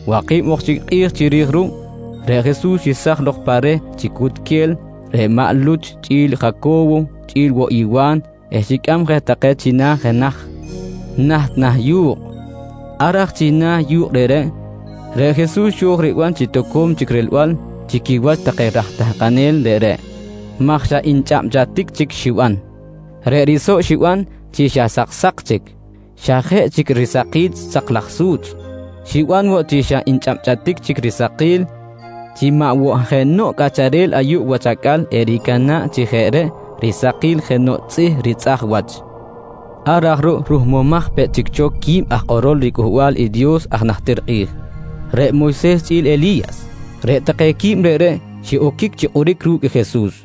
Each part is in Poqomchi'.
Waki̱b ok chic kꞌi̱j chiri̱j ruꞌ, reꞌ Jesus xesaj lok pa reh chi cutquel reꞌ maꞌ Luch chꞌi̱l Jaco̱wo chꞌi̱l woꞌ i Wa̱n eh xicꞌam je take china̱ jenaj naht na̱ yu̱kꞌ. Ar aj china̱ i yu̱kꞌ reꞌreꞌ, reꞌ Jesus xo̱j riban chi toco̱m chic rilbal chi quiwach take aj tahkanel reꞌreꞌ maj xa nchꞌabchꞌatic chic xiban. Reꞌ risoꞌ xiban chi xa saksa̱k chic xa jeꞌ chic risakil sak laj su̱tzꞌ, xiban woꞌ chi xa nchꞌabchꞌatic chic risakil chi maꞌ woꞌ jenoꞌ cꞌacharel ayuꞌ wach acꞌal ericana̱ꞌ chi jeꞌ reꞌ risakil jenoꞌ tzꞌih ritzꞌaj wach. Ar aj ruꞌ ruhmumaj peꞌ chic cho quib aj kꞌorol riCꞌuhbal i Dios aj najtir kꞌi̱j, reꞌ Moyses chꞌi̱l Eli̱yas. Reꞌ take quib reꞌreꞌ xiꞌoquic chi kꞌoric ru̱cꞌ i Jesus.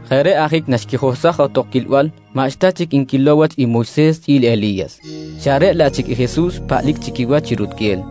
Jeꞌ reꞌ ajic naxquijohsaj johtok quilbal, maꞌxta chic nquilow wach i Moyses chꞌi̱l Eli̱yas, xa reꞌ laꞌ chic i Jesus paꞌlic chi quiwach chi rutquel.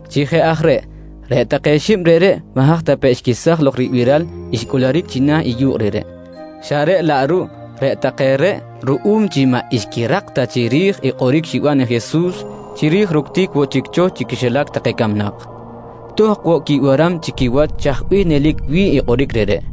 Chi jeꞌ aj reꞌ, reꞌ take xib reꞌreꞌ maꞌ haj ta pe xquesaj lok ribiral reꞌ xcꞌuluric china̱ i yu̱kꞌ reꞌreꞌ, xa reꞌ laꞌ ruꞌ reꞌ take reꞌ ruꞌum chi maꞌ xquirak tak chiri̱j i kꞌoric xiban i Jesus chiri̱j ructic woꞌ chic cho chi quixilac take camnak, tohkꞌ woꞌ quibiram chi quiwach chaj bih nelic wi̱ꞌ i kꞌoric reꞌreꞌ.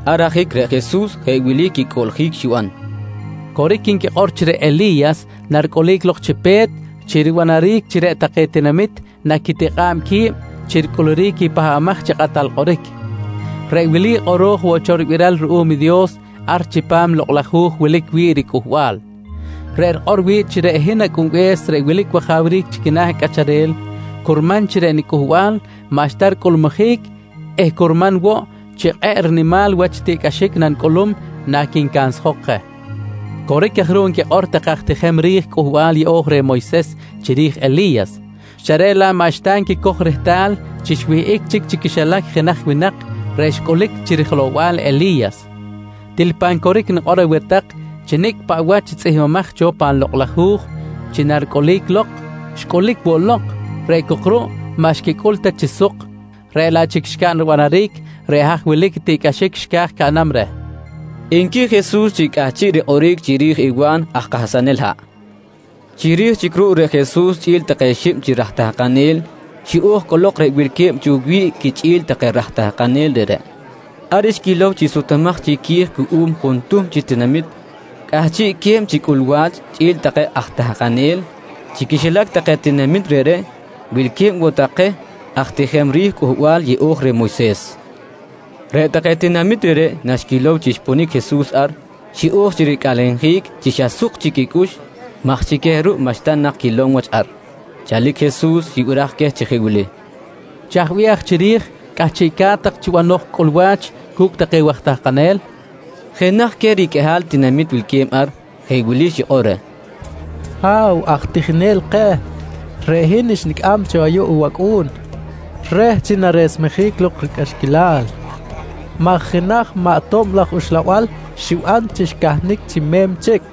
Ar ajic reꞌ Jesus jeꞌ wili quicꞌuꞌljic xiban: «Coric nquikꞌor chi reꞌ Eli̱yas naricꞌulic lok chi pe̱t chi ribanaric chi reꞌ take tinamit naquitikꞌa̱b qui̱b chi ricꞌuluric i Pahbamaj chi Kꞌatal Kꞌoric. Reꞌ wili kꞌoro̱j woꞌ cho ribiral ruꞌum i Dios ar chipam i Lokꞌ laj Hu̱j wilic wi̱ꞌ riCꞌuhbal, reꞌ rikꞌor wi̱ꞌ chi reꞌ hin Acꞌunbe̱s reꞌ wilic wajawric chi quina̱ cꞌacharel, curman chi reꞌ niCꞌuhbal maꞌxta ricꞌulmujic eh curman woꞌ chi kꞌe̱ꞌ rinimal wach tiꞌcꞌaxic nanicꞌulum naquincansjok je. Coric aj ruꞌ nquikꞌor take aj tijem ri̱j i Cꞌuhbal Yeꞌo̱j reh Moyses chiri̱j i Eli̱yas, xa reꞌ laꞌ maꞌxta nquicoj rehtal chi xwihꞌic chic chi quixilac jenaj winak reꞌ xcꞌulic chi rijelow-bal i Eli̱yas. Til pan coric nikꞌor aweh tak chi nicꞌ paꞌ wach tzꞌihmbimaj cho pan Lokꞌ laj Hu̱j chi naricꞌulic lok, xcꞌulic woꞌ lok reꞌ cok ruꞌ maꞌ xquicꞌul ta chi suk reꞌ laꞌ chic xcaꞌn ribanaric reꞌ haj wilic tiꞌcꞌaxic xca̱j caꞌnam reh, nqui Jesus chi cꞌahchiꞌ rikꞌoric chiri̱j Wa̱n aj kahsanel haꞌ. Chiri̱j chic ruꞌ reꞌ Jesus chꞌi̱l take xib chi raj tahkanel xiꞌo̱j cꞌolok reꞌ wilque̱b cho wi̱ꞌ quichꞌi̱l take aj tahkanel reꞌreꞌ. Ar xquilow chi sutumaj chic qui̱j cuꞌum juntuhm chi tinamit cꞌahchiꞌque̱b chi cꞌulwa̱ch chꞌi̱l take aj tahkanel. Chi quixilac take tinamit reꞌreꞌ wilque̱b woꞌ take queh aj tijem ri̱j Cꞌuhbal Yeꞌo̱j reh Moyses. Reꞌ take tinamit reꞌreꞌ naxquilow chi xponic i Jesus ar xiꞌo̱j chi ricꞌalenjic chi xa suk chic quicꞌux maj chi queh ruꞌ maꞌxta nak quilom wach ar. Chalic Jesus xibiraj queh chi jeꞌ wili: «Chaj bih aj chiri̱j cꞌahchiꞌca̱t tak chi banoj cꞌulwa̱ch cu̱cꞌ take waj tahkanel? nqui queh. Jenaj queh riqꞌuihal tinamit wilque̱b ar, jeꞌ wili xikꞌor reh: «Ha̱w aj tijinel keh, reꞌ hin xnicꞌam cho ayuꞌ i wacꞌu̱n reh chi naresmejic lok ricꞌaxquilal maj jenaj maꞌ tob laj uxlabal xiban chi xcahnic chi me̱m chic.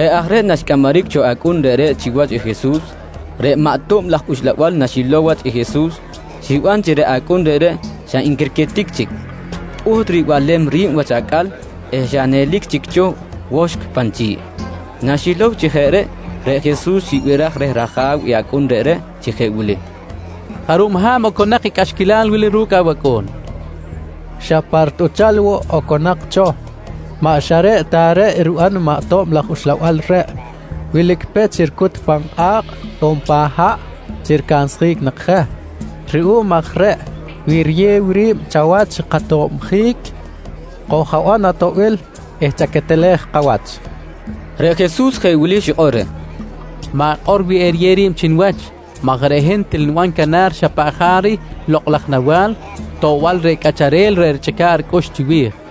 Jeꞌ aj reꞌ naxcꞌamaric cho i acꞌun reꞌreꞌ chiwach i Jesus, reꞌ maꞌ tob laj uxlabal xilow wach i Jesus xiban chi reꞌ acꞌun reꞌreꞌ xa nquirquitic chic, pꞌuht ribalem ri̱b wach acꞌal eh xa nelic chi cho woxkꞌ pan chi̱ꞌ. Naxilow chi jeꞌ reꞌ, reꞌ Jesus xibiraj reh raja̱w i acꞌun reꞌreꞌ chi jeꞌ wili: «Jarub ha̱b oconak i cꞌaxquilal wili ru̱cꞌ awacꞌu̱n? nqui reh. —Xa pa ritꞌuchal woꞌ oconak cho. Maꞌ xa reꞌ ta reꞌ riban i maꞌ tob laj uxlabal reh. Wilic pech ricut pan kꞌa̱kꞌ on pan haꞌ chi ricansjic nak je. Ruꞌum aj reꞌ, wi eriyew ri̱b chawach katobjic, koj-aban atoꞌbil eh chaquetelej kawach, nqui ajabe̱s reꞌreꞌ. Reꞌ Jesus jeꞌ wili xikꞌor reh: «Ma̱kꞌor wi eriyew ri̱b chi niwach maj reꞌ hin til niban canar xa paꞌ jaric lokꞌ laj nawa̱l toꞌbal reh cꞌacharel reꞌ richꞌica̱ꞌ ricꞌux chiwi̱j, nqui Jesus.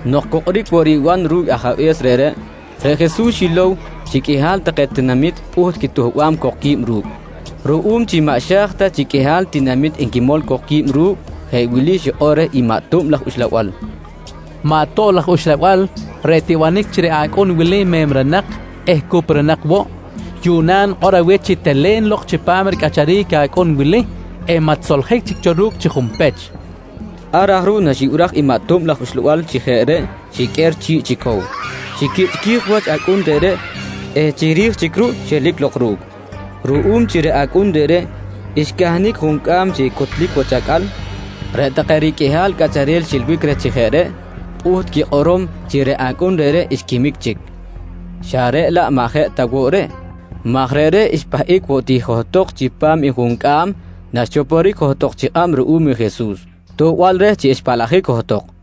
Nok cu kꞌoric woꞌ riban ru̱cꞌ ajabe̱s reꞌreꞌ, reꞌ Jesus xilow chi qꞌuihal take tinamit pꞌuht quituhbam cok que̱b ru̱cꞌ. Ruꞌum chi maꞌ xa̱j ta chi qꞌuihal tinamit enquimol cok qui̱b ru̱cꞌ, jeꞌ wili xikꞌor reh i maꞌ tob laj uxlabal: «Maꞌ tob laj uxlabal reꞌ tibanic chi reꞌ acꞌun wili memrenak eh cuprunak woꞌ, yuꞌna nikꞌor aweh chi telen lok chipam ricꞌacharic i acꞌun wili eh maꞌ tisoljic chic cho ru̱cꞌ chi junpech, nqui reh. Ar aj ruꞌ naxibiraj i maꞌ tob laj uxlabal chi jeꞌ reꞌ xiqꞌuer chi̱ꞌ chi cow, xiquichꞌquij wach acꞌun reꞌreꞌ eh chiri̱j chic ruꞌ xelic lok ru̱cꞌ. Ruꞌum chi reꞌ acꞌun reꞌreꞌ xcahnic juncꞌam chi cutlic wach acꞌal, reꞌ take riqꞌuihal cꞌacharel xiꞌilbic reh chi jeꞌ reꞌ pꞌuht quikꞌorom chi reꞌ acꞌun reꞌreꞌ xquimic chic xa reꞌ laꞌ maꞌ jeꞌ ta woꞌ reꞌ, maj reꞌreꞌ xpahꞌic woꞌ ti johtok chipam i juncꞌam naxchoporic johtok chi kꞌab ruꞌum i Jesus toꞌbal reh chi xpaꞌlajic johtok.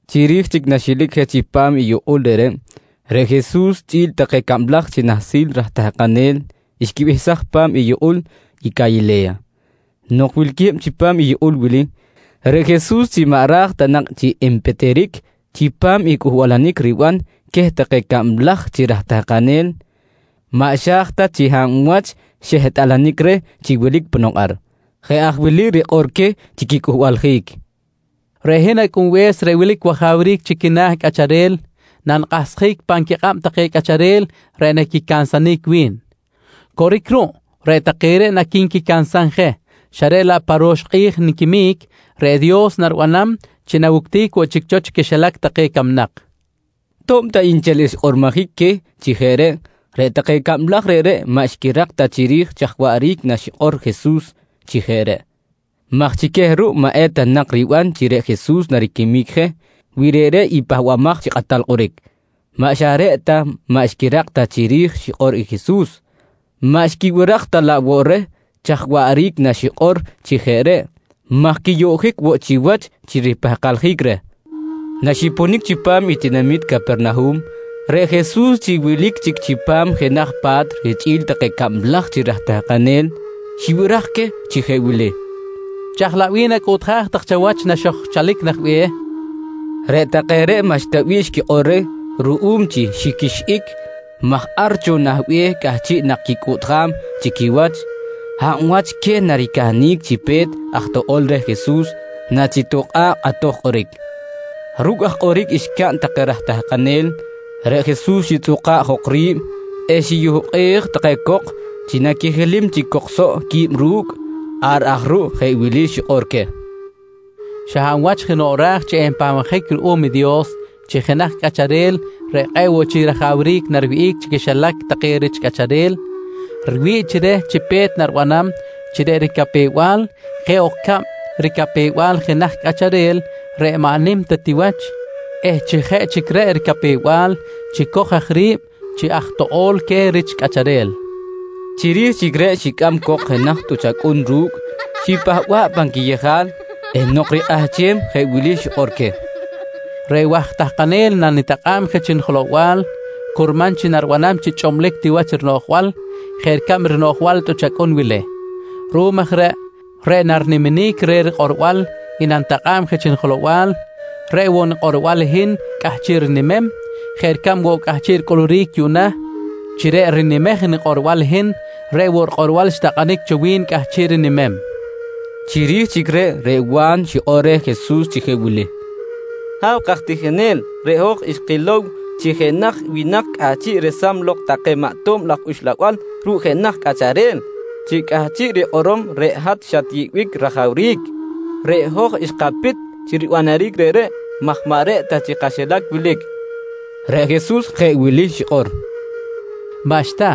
Chiri̱j chic naxiꞌelic je chipam i yukꞌul reꞌreꞌ, reꞌ Jesus chꞌi̱l take cablaj chi nahsil raj tahkanel xquibehsaj pa̱m i yukꞌul i Calile̱ya. Nok wilque̱b chipam i yukꞌul wili, reꞌ Jesus chi maꞌ ra̱j ta nak chi enpitiric chipam i cꞌuhbalanic riban queh take cablaj chi raj tahkanel maꞌ xa̱j ta chi hab wach xehtꞌalanic reh chi wilic ponok ar. Jeꞌ aj wili rikꞌor queh chi quicꞌuhbaljic: «Reꞌ hin Acꞌunbe̱s reꞌ wilic wajawric chi quina̱ cꞌacharel nanikꞌahsjic pan quikꞌab take cꞌacharel reꞌ naquicansanic wi̱n. Coric ruꞌ reꞌ take reꞌ naqui̱nquicansam je xa reꞌ laꞌ pa ro̱x kꞌi̱j niquimic, reꞌ Dios naribanam chi nawuctic woꞌ chic cho chi quixilac camnak, nqui queh. To̱b ta nchel xkꞌormojic queh chi jeꞌ reꞌ, reꞌ take cablaj reꞌreꞌ maꞌ xquirak ta chiri̱j chaj waꞌric naxikꞌor i Jesus chi jeꞌ reꞌ maj chi queh ruꞌ maꞌ eta nak riban chi reꞌ Jesus nariquimic je wi reꞌreꞌ i Pahbamaj chi Kꞌatal Kꞌoric. Maꞌ xa reꞌ ta maꞌ xquirak ta chiri̱j xikꞌor i Jesus, maꞌ xquibiraj ta laꞌ woꞌ reh chaj waꞌric naxikꞌor chi jeꞌ reꞌ maj quiyoꞌjic woꞌ chiwach chi ripahkaljic reh. Naxiponic chipam i tinamit Capernahum, reꞌ Jesus chi wilic chic chipam jenaj pa̱t richꞌi̱l take cablaj chi raj tahkanel xibiraj queh chi jeꞌ wili: «Chaj laꞌ bih nacꞌuꞌtjaj tak chawach naxo̱j chalic nah be̱h? nqui queh. Reꞌ take reꞌ maꞌxta bih xquikꞌor reh ruꞌum chi xiqꞌuixꞌic maj ar cho nah be̱h cꞌahchiꞌ nak quicꞌuꞌtjam chi quiwach, hab wach queh naricahnic chi pe̱t aj toꞌo̱l reh i Jesus nachitokꞌa̱ꞌ kꞌatoj kꞌoric. Ru̱cꞌ aj kꞌoric xcaꞌn take raj tahkanel, reꞌ Jesus xitzꞌuka̱ꞌ jok ri̱b eh xiyukꞌej take cok chi naquijilim chic cok soꞌ quib ru̱cꞌ. Ar aj ruꞌ jeꞌ wili xikꞌor queh: «Xa hab wach jenoꞌ ra̱j chi enpahbabjic ruꞌum i Dios chi jenaj cꞌacharel reꞌ kꞌe̱ꞌ woꞌ chic rajawric nariwihꞌic chi quixilac take rich cꞌacharel, riwi̱ꞌ chi reh chi pe̱t naribanam chi reꞌ ricapew-bal jeꞌ ok ricab ricapew-bal i jenaj cꞌacharel reꞌ maꞌ nim ta ti wach eh chi jeꞌ chic reꞌ ricapew-bal chicoj aj ri̱b chi aj toꞌo̱l queh rich cꞌacharel, nqui queh. Chiri̱j chic reꞌ xicꞌam cok jenaj tꞌuch acꞌun ru̱cꞌ, xipahba̱ꞌ pan quiyejal eh nok rikꞌahchem jeꞌ wili xikꞌor queh: «Reꞌ waj tahkanel nanitakꞌa̱b je chi nijelow-bal curman chi naribanam chi xa chꞌublic ti wach rinoꞌjbal jeꞌ ricab rinoꞌjbal i tꞌuch acꞌun wili. Ruꞌum aj reꞌ, reꞌ nariniminic reh rikꞌorbal i nanitakꞌa̱b je chi nijelow-bal, reꞌ woꞌ nikꞌorbal i hin cꞌahchiꞌ rinimem jeꞌ ricab woꞌ cꞌahchiꞌ ricꞌuluric yuꞌna chi reꞌ rinimej nikꞌorbal i hin, reꞌ woꞌ rikꞌorbal xtakꞌanic cho wi̱n cꞌahchiꞌ rinimem, nqui Jesus queh take raj tahkanel. Chiri̱j chic reꞌ, reꞌ Wa̱n xikꞌor reh Jesus chi jeꞌ wili: «Ha̱w kaj tijinel, reꞌ hoj xkilow chi jenaj winak cꞌahchiꞌ resam lok take maꞌ tob laj uxlabal ru̱cꞌ jenaj cꞌacharel, chi cꞌahchiꞌ rikꞌorom reꞌ hat xatyeꞌbic rajawric. Reꞌ hoj xkapit chi ribanaric reꞌreꞌ maj maꞌ reꞌ ta chi kaxilac wilic, nqui reh Jesus. Reꞌ Jesus jeꞌ wili xikꞌor: «Maꞌxta,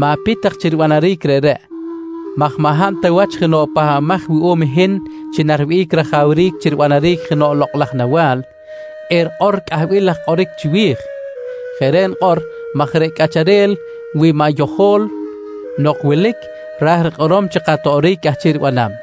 ma̱pit tak chi ribanaric reꞌreꞌ maj maꞌ hab ta wach jenoꞌ pahbamaj wuꞌum i hin chi nariwihꞌic rajawric chi ribanaric jenoꞌ lokꞌ laj nawa̱l, erikꞌor cꞌahbil laj kꞌoric chiwi̱j. Jeꞌ reꞌ nikꞌor maj reꞌ cꞌacharel wi maꞌ yojo̱l nok wilic, ra̱j rikꞌorom chi katoꞌoric cꞌahchiꞌ ribanam.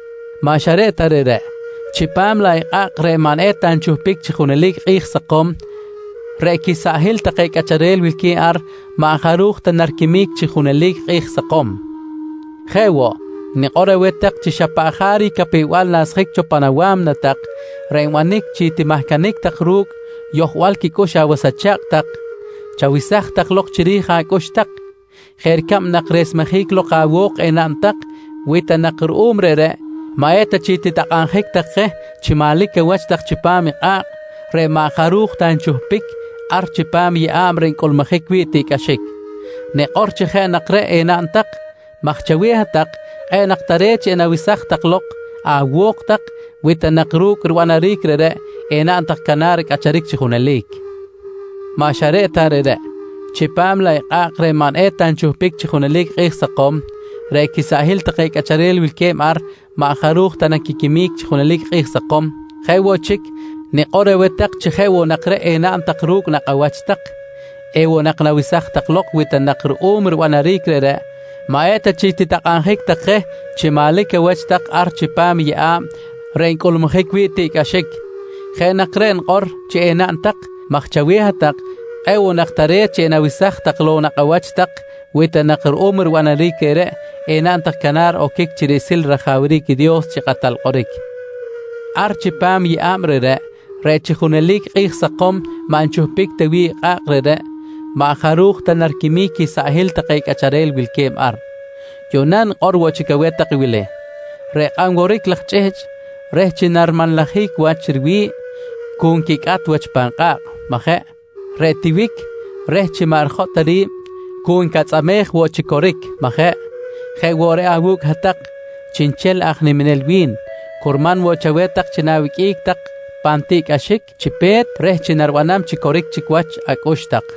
Maꞌ xa reꞌ ta reꞌreꞌ, chipam laꞌ i kꞌa̱kꞌ reꞌ maꞌ eta nchuhpic chi junelic kꞌi̱j sakom, reꞌ quisaꞌhil take cꞌacharel wilque̱b ar, maꞌ jaruj ta naquiquimic chi junelic kꞌi̱j sakom. «Jeꞌ woꞌ, nikꞌor aweh tak chi xa paꞌ jaric capew-bal nasjic cho pan awa̱mna tak reꞌ nbanic chi timahcanic tak ru̱cꞌ yojbal quicꞌux awas acha̱kꞌ tak, chawesaj lok chiri̱j acꞌux tak jeꞌ ricab nak resmejic lok awo̱k enaꞌn tak wi ta nak ruꞌum reꞌreꞌ maꞌ eta chic titakꞌabjic tak je chi manlic awach tak chipam i kꞌa̱kꞌ reꞌ maꞌ jaruj ta nchuhpic ar chipam i yeꞌa̱b reꞌ ncꞌulmujic wi̱ꞌ tiꞌcꞌaxic. Nikꞌor chi jeꞌ nak reꞌ enaꞌn tak maj chaweh hat-tak, kꞌe̱ꞌ nak tare̱t chi enawesaj tak lok awo̱k tak, wi ta nak ru̱cꞌ ribanaric reꞌreꞌ enaꞌn tak canar cꞌacharic chi junelic. Maꞌ xa reꞌ ta reꞌreꞌ, chipam laꞌ i kꞌa̱kꞌ reꞌ maꞌ eta nchuhpic chi junelic kꞌi̱j sakom, reꞌ quisaꞌhil take cꞌacharel wilque̱b ar, maꞌ jaruj ta naquiquimic chi junelic kꞌi̱j sakom. «Jeꞌ woꞌ chic, nikꞌor aweh tak chi jeꞌ woꞌ nak reꞌ enaꞌn tak ru̱cꞌ nakꞌ awach tak, ewoꞌ nak nawesaj tak lok wi ta nak ruꞌum ribanaric reꞌreꞌ maꞌ eta chic titakꞌabjic tak je chi manlic awach tak ar chipam i yeꞌa̱b reꞌ ncꞌulmujic wi̱ꞌ tiꞌcꞌaxic. Jeꞌ nak reꞌ nikꞌor chi enaꞌn tak maj chaweh hat-tak kꞌe̱ꞌ woꞌ nak tare̱t chi enawesaj tak lok i nakꞌ awach tak, wi ta nak ruꞌum ribanaric reꞌreꞌ enaꞌn tak canar oquic chi riꞌsil rajawric i Dios chi kꞌatal kꞌoric. Ar chipam i yeꞌa̱b reꞌreꞌ, reꞌ chi junelic kꞌi̱j sakom maꞌ nchuhpic ta wi̱ꞌ i kꞌa̱kꞌ reꞌreꞌ, maꞌ jaruj ta nariquimic quisaꞌhil take cꞌacharel wilque̱b ar. «Yuꞌna nikꞌor woꞌ chic aweh tak wili: Reꞌ kꞌan woric laj chꞌihchꞌ reh chi narimanlajic wach riwi̱ꞌ, cu nquicꞌat wach pan kꞌa̱kꞌ, majeꞌ? Reꞌ i tiwic reh chi maꞌ eta rijotꞌ ri̱b cu ncatzꞌamej woꞌ chi coric, majeꞌ? Jeꞌ woꞌ reꞌ awu̱cꞌ hat-tak chiꞌnchel aj niminel wi̱n, curman woꞌ chaweh tak chi na̱wiqꞌuic tak pan tiꞌcꞌaxic chi pe̱t reh chi naribanam coric chic wach acꞌux tak.